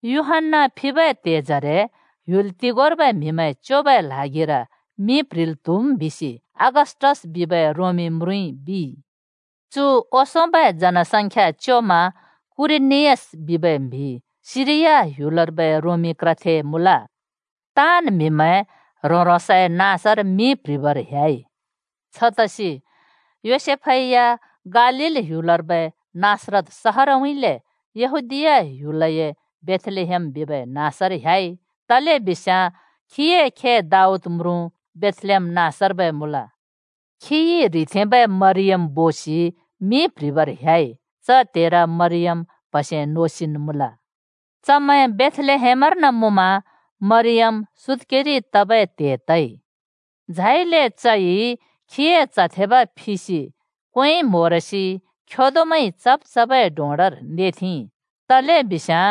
यूहन्‍ना फिबै त्‍हेजरे ह्‍युल तोगोंर्बै म्‍हिमैं च्योबै ल्हागिर मिं प्‍ह्रिल् त्‍हुम् बिसि अगस्‍टस बिबै रोमी म्रुँइ बिइ। (चु ओंसोंबै जनसंख्या च्योमा क्‍युरिनियस बिबै म्‍हि सिरिया ह्‍युलर्बै रोमी क्रथे मुँल।) ताँन् म्‍हिमैं ह्रों-ह्रोंसए नाँसर मिं प्‍ह्रिबर ह्‍याइ। छतसि योसेफै या गालील ह्‍युलर्बै नासरत सहरउँइँले यहूदीया ह्‍युलए बेथलेहेम बिबै नाँसर ह्‍याइ, तलेबिस्याँ चए खे दाऊद म्रुँ च बेथलेहेम नाँसर्बै मुँल। चइ ह्रिथेंबै मरियम बोसि मिं प्‍ह्रिबर ह्‍याइ। च त्‍हेर मरियम प्‍हसे नोसिन् ‍मुँल, धै बेथलेहेमर मुँमा मरियम सुत्‍केरि तबै त्‍हे तइ। झाइले चइ ह्रोंसए च्‍ह थेब फिसि क्वेंइ म्होरसि खेदोमैंइ चब् चबै डोंडर नेथेंइ, तलेबिस्याँ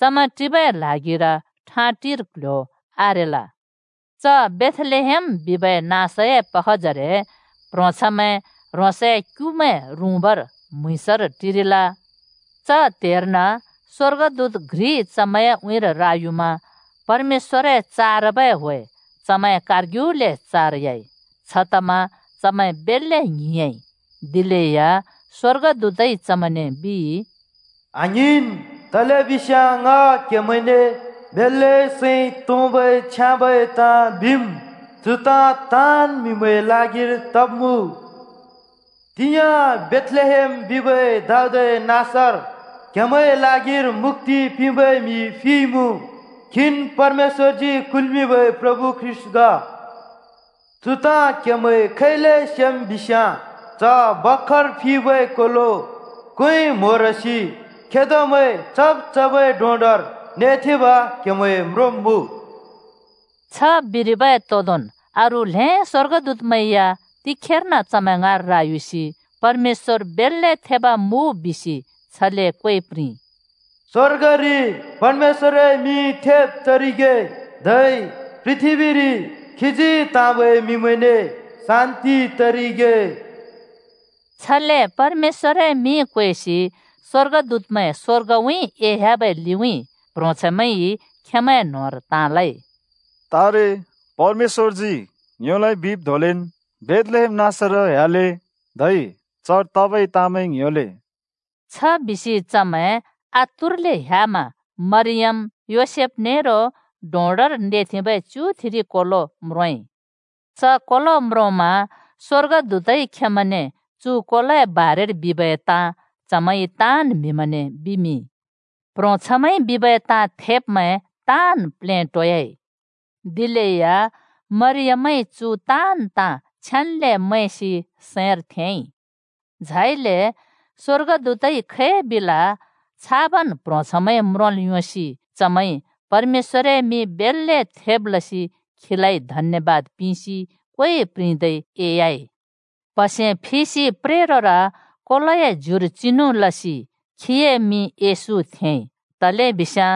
चमैं टिबै ल्हागिर ठाँटिर क्‍ल्‍ह्‍यो आरेल। च बेथलेहेम बिबै नाँसए पखजरे प्‍ह्रोंछैंमैं ह्रोंसए क्‍युमैं रुँबर म्‍हुँइँसर टिरिल। च त्हेर्न स्‍वर्गदूत घ्रि चमैंए उँइँर रायुमा परमेश्‍वरए चारबै ह्‍वे चमैंए कारग्युले चारइ। छतमा चमैं बेल्‍ले ङ्हिंयाँइ। दिलेया स्‍वर्गदूतइ चमैंने बिइ, “आङ्हिंन्! तलेबिस्याँ ङ क्‍हेमैंने बेल्‍ले सैं तोंबै छ्याँबै ताँ बिम्। चु ताँ ताँन् म्‍हिमैंए ल्हागिर तब्मुँ। तिंयाँ बेथलेहेम बिबै दाऊदए नाँसर क्‍हेमैंए ल्हागिर मुक्‍ति पिंबै म्‍हि फिइमुँ। खीन परमेश्‍वरजी कुल्‍मिंबै प्रभु ख्रीष्‍ट ग। चु ताँ क्‍हेमैंइ खै‍ले सेम् बिस्याँ च भर्खर फिबै कोलो क्वेंइ म्होरसि खेदोमैंइ चब् चबै डोंडर नेथेंब क्‍हेमैंइ म्रोंब्मुँ।” छ बिरिबै तोदोंन् अरू ल्हें स्वर्गदूतमैं या तिखेर्न चमैं ङाँर रायुसि परमेश्‍वर बेल्‍ले थेब मुँ बिसि छले क्वे प्रिंइ, “स्वर्गरि परमेश्‍वए मिं थेब तरिगे, धै पृथ्‍बीरि खीजी त्‍हाँबै म्‍हिमैंने शान्‍ति तरिगे!” छले परमेश्‍वरए मिं क्वेसि स्वर्गदूतमैं स्‍वर्गउँइँ एह्‍याबै लिउँइँ। प्‍ह्रोंछैंमैंइ खेंमैंए न्होंर ताँ लइ, “तारे परमेश्‍वरजी ङ्योलाइ बिब् धोंलेन् बेथलेहेम नाँसर ह्‍याले धै चर तबै ताँमैं ङ्‍ह्‍योले।” छ बिसि चमैं आतुरले ह्‍यामा मरियम, योसेफ नेरो डोंडर नेथेंबै च्‍युथिरि कोलो म्रोंइ। च कोलो म्रोंमा स्‍वर्गदूतइ खेंमैंने चु कोलोए बारेर बिबै ताँ चमैंइ ताँन् म्‍हिमैंने बिमिंइ। प्ह्रोंछैंमैंइ बिबै ताँ थेब्‍मैं ताँन् प्लेटोयाइ। दिलेया मरियमइ चु ताँन् ताँ छेन्‍ले मैंसि सैंर थेंइ। झाइले स्‍वर्गदूतइ खै बिल छाबन् प्ह्रोंछैंमैंइ म्रोंल् योंसि चमैंइ परमेश्‍वरए मिं बेल्‍ले थेब् लसि खीलाइ धन्‍यबाद पिंसि क्वे प्रिंदै एह्‍याइ। प्‍हसे फिसि प्रेरोर कोलोए ज्युर चिनु लसि खीए मिं येशू थेंइ, तलेबिस्याँ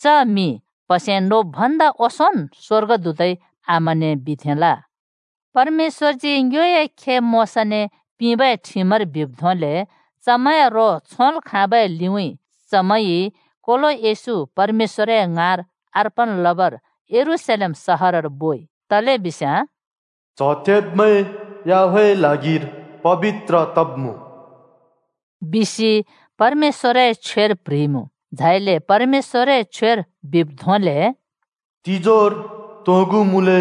च मिं प्‍हसे नोब् भन्दा ओंसोंन् स्‍वर्गदूतइ आमाने बिथेंल। परमेश्‍वरजी ङ्योए खे मोशाने पिंबै ठिमर बिब् धोंले चमैंए रो छोंल् खाँबै लिउँइँ चमैंइ कोलो येशू परमेश्‍वरए ङाँर अर्पण लबर यरूशलेम सहरर बोइ। तलेबिस्याँ “च्‍ह थेब्मैं याहवेहए ल्हागिर पबित्र तब्मुँ,” बिसि परमेश्‍वरए छ्वेर प्‍ह्रिइमुँ। झाइले परमेश्‍वरए छ्वेर बिब् धोंले “तिजोर तोंगु मुँले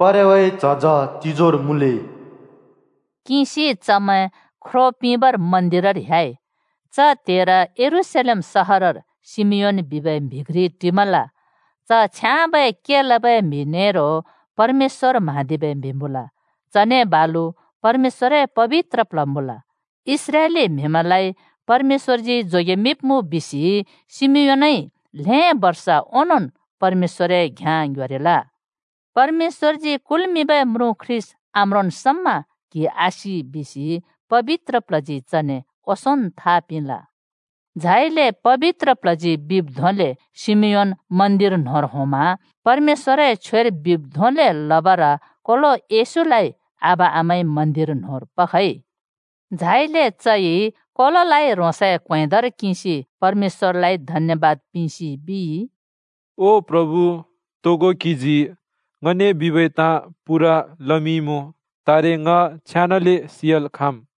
परेवाए झज तिजोर मुँले” किंसि चमैं ख्रों पिंबर मन्दिरर ह्‍याइ। च त्‍हेर यरूशलेम सहरर शिमियोन बिबै म्‍हि घ्रि टिमल। च छ्याँबै के लबै म्‍हि नेरो परमेश्‍वर म्हाँदिबै म्‍हि मुँल, चने बालु परमेश्‍वरए पबित्र प्ल्ह मुँल। इस्राएली म्‍हिमैंलाइ परमेश्‍वरजी जोगेमिंब्मुँ बिसि शिमियोनइ ल्हें बर्ष ओंनोंन् परमेश्‍वरए घ्याँ ङ्ह्‍योरिल। परमेश्‍वरजी कुल्‍मिंबै म्रुँ ख्रीष्‍ट आम्रोंन् समा क्हि आसि बिसि पबित्र प्ल्हजी चने ओंसोंन् था पिंल। झाइले पबित्र प्ल्हजी बिब् धोंले शिमियोन मन्दिर न्होंर होंमा। परमेश्‍वरए छ्वेर बिब् धोंले लबर कोलो येशूलाइ आबा-आमाइ मन्दिर न्होंर पखइ। झाइले चइ कोलोलाइ ह्रोंसए क्वेंदर किंसि परमेश्‍वरलाइ धन्यबाद पिंसि बिइ, “ओ प्रभु, तोगो क्‍हिजी ङने बिबै ताँ पूरा लमिंइमुँ, तारे ङ छेनाले सि‍याल् खाँम्।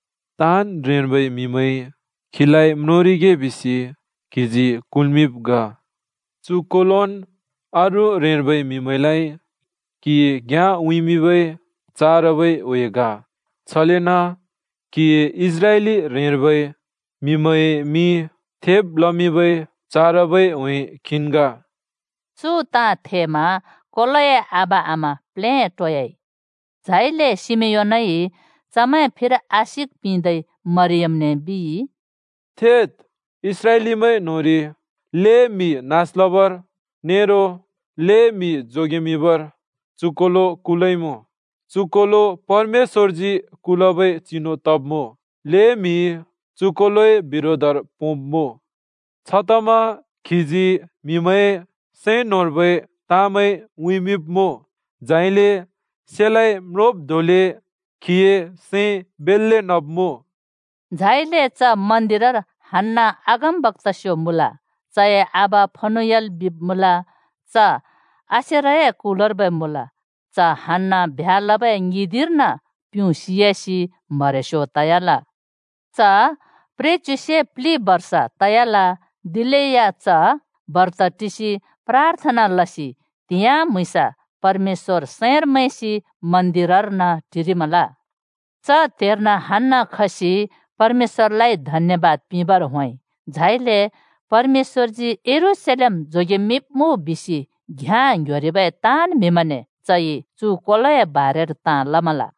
ताँन् ह्रेंर्बै म्हिमैंइ खीलाइ म्रोंरिगे बिसि क्हिजी कुल्मिंब् ग। चु कोलोन् अरू ह्रेंर्बै म्‍हिमैंलाइ क्‍हिए घ्‍याँ उँइँमिंबै चारबै ह्‍वे ग, छलेन क्हिए इस्राएली ह्रेंर्बै म्‍हिमैंए मिं थेब् लमिंबै चारबै ह्‍वे खीन् ग।” चु ताँ थेमा कोलोए आबा-आमा प्लेटोयाइ। झाइले शिमियोनइ चमैं फिर आशिक पिंदै मरियमने बिइ, “थेद्, इस्राएलीमैं न्होंरि ल्हें म्हि नास लबर नेरो ल्हें म्हि जोगेमिंबर चु कोलो कुलइमुँ। चु कोलो परमेश्‍वरजी कुलबै चिनु तब्मुँ, ल्हें म्हिइ चु कोलोए बिरोधर पोंब्मुँ। छतमा खीजी म्‍हिमैंए सैं न्‍होंर्बै ताँमैं उँइँमिंब्‍मुँ। झाइले सेलाँइ (तरवारइ) म्‍लोब् धोंले क्‍हिए सैं बेल्‍ले नब्‍मुँ।” झाइले च मन्दिरर हन्‍ना अगमबक्‍तास्यो मुँल। च‍ए आबा फनुएल बिब् मुँल, च आशेरए कुलर्बै मुँल। च हन्‍ना ब्ह्‍या लबै ङिदिंर्न प्युँ सियासि म्हरेस्यो तयाल। च प्रेच्‍युसे प्‍लिदिं बर्ष तयाल। दिलेया च बर्त टिसि प्राथना लसि त्‍हिंयाँ म्‍हुँइँसा परमेश्‍वर सैंर मैंसि मन्दिरर्न टिरिमल। च त्‍हेर्न हन्‍ना खसि परमेश्‍वरलाइ धन्‍यबाद पिंबर होंइ। झाइले परमेश्‍वरजी यरूशलेम जोगेमिंब्मुँ बिसि घ्याँ ङ्ह्‍योरिबै ताँन् म्हिमैंने चइ चु कोलोए बारेर ताँ लमल।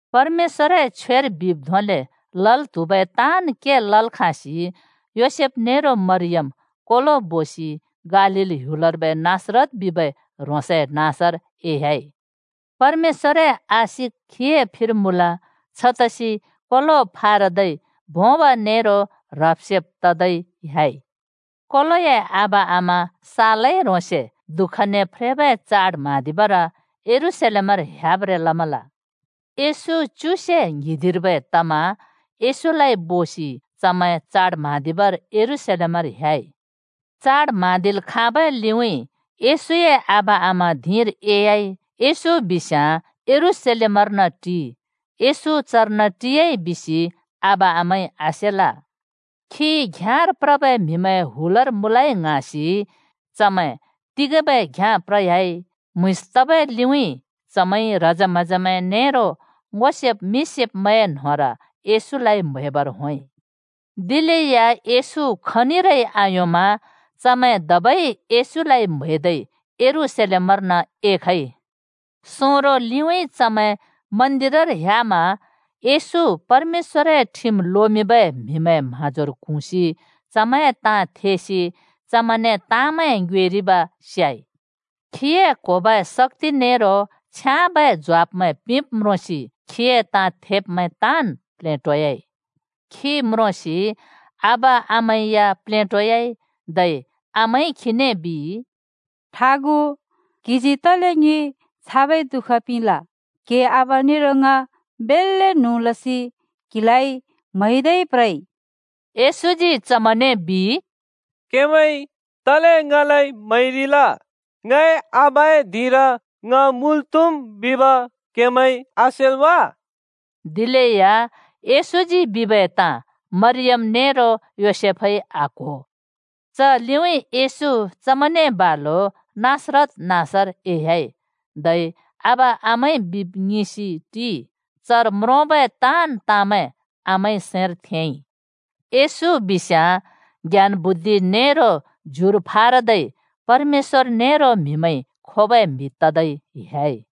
परमेश्‍वरए छ्वेर बिब् धोंले लल् त्‍हुबै ताँन् के लल् खाँसि योसेफ नेरो मरियम कोलो बोसि गालील ह्‍युलर्बै नासरत बिबै ह्रोंसए नाँसर एह्‍याइ। परमेश्‍वरए आशिक खीए फिर मुँल। छतसि कोलो फारदै भोंब नेरो ह्रब-सेब त‍दै ह्‍याइ। कोलोए आबा आमा सालै ह्रोंसे दुःखने फ्रेबै चाड म्हाँदिबर यरूशलेमर ह्‍याब्रें लमल। येशू च्युसे ङ्हिंदिंर्बै तमा येशूलाइ बोसि चमैं चाड म्हाँदिबर यरूशलेमर ह्‍याइ। चाड म्हाँदिल् खाँबै लिउँइँ येशूए आबा आमा धिंर एह्‍याइ। येशू बिस्याँ यरूशलेमर्न टिइ। येशू चर्न टियाइ बिसि आबा आमाइ आसेल। खी घ्‍याँर प्रबै म्हिमैंए हुलर मुँलै ङ्हाँसि चमैं तिंगेंबै घ्‍याँ प्रइ ह्‍याइ। म्हुँइँस तबै लिउँइँ चमैंइ ह्रजे-म्हजेमैं नेरो ङो सेब् मिं सेब्‍मैंए न्‍होंर येशूलाइ म्‍हैबर होंइ। दिलेया येशू खनिरै आयोंमा चमैं धबै येशू म्हैदै यरूशलेमर्न एखइ। सोंरो लिउँइँ चमैं मन्दिरर ह्‍यामा येशू परमेश्‍वरए ठिम लोमिंबै म्हिमैंए म्हाँजोर क्हुँसि चमैंए ताँ थेसि चमैंने ताँमैं ङ्योएरिब स्याइ। खीए क्होबै शक्‍ति नेरो छ्याँबै ज्वाफमैं पिंब् म्रोंसि खीए ताँ थेब्मैं ताँन् प्लेटोयाइ। खी म्रोंसि आबा आमा या प्लेटोयाइ। धै आमाइ खीने बिइ, “ठागु, क्‍हिजी तले ङि छाबै दुःख पिंल? क्‍हिए आबा नेरो ङ बेल्‍ले न्हुँ लसि क्हिलाइ म्‍हैदै प्रइ!” येशूजी चमैंने बिइ, “क्हेमैंइ तले ङलाइ म्‍हैरिल? ङए आबाए धिंर ङ मुँल् त्‍हुम् बिब क्‍हेमैंइ आसेल् वा?” दिलेया येशूजी बिबै ताँ मरियम नेरो योसेफइ आक्‍हो। च लिउँइँ येशू चमैंने बालु नासरत नाँसर एह्‍याइ, धै आबा आमाइ बिब् ङिंसि टिइ। चर म्रोंबै ताँन् ताँमैं आमाइ सैंर थेंइ। येशू बिस्याँ ज्ञान बुद्धि नेरो ज्युर फारदै परमेश्‍वर नेरो म्हिमैंइ खोबै ‍म्हि तदै ह्‍या‍इ।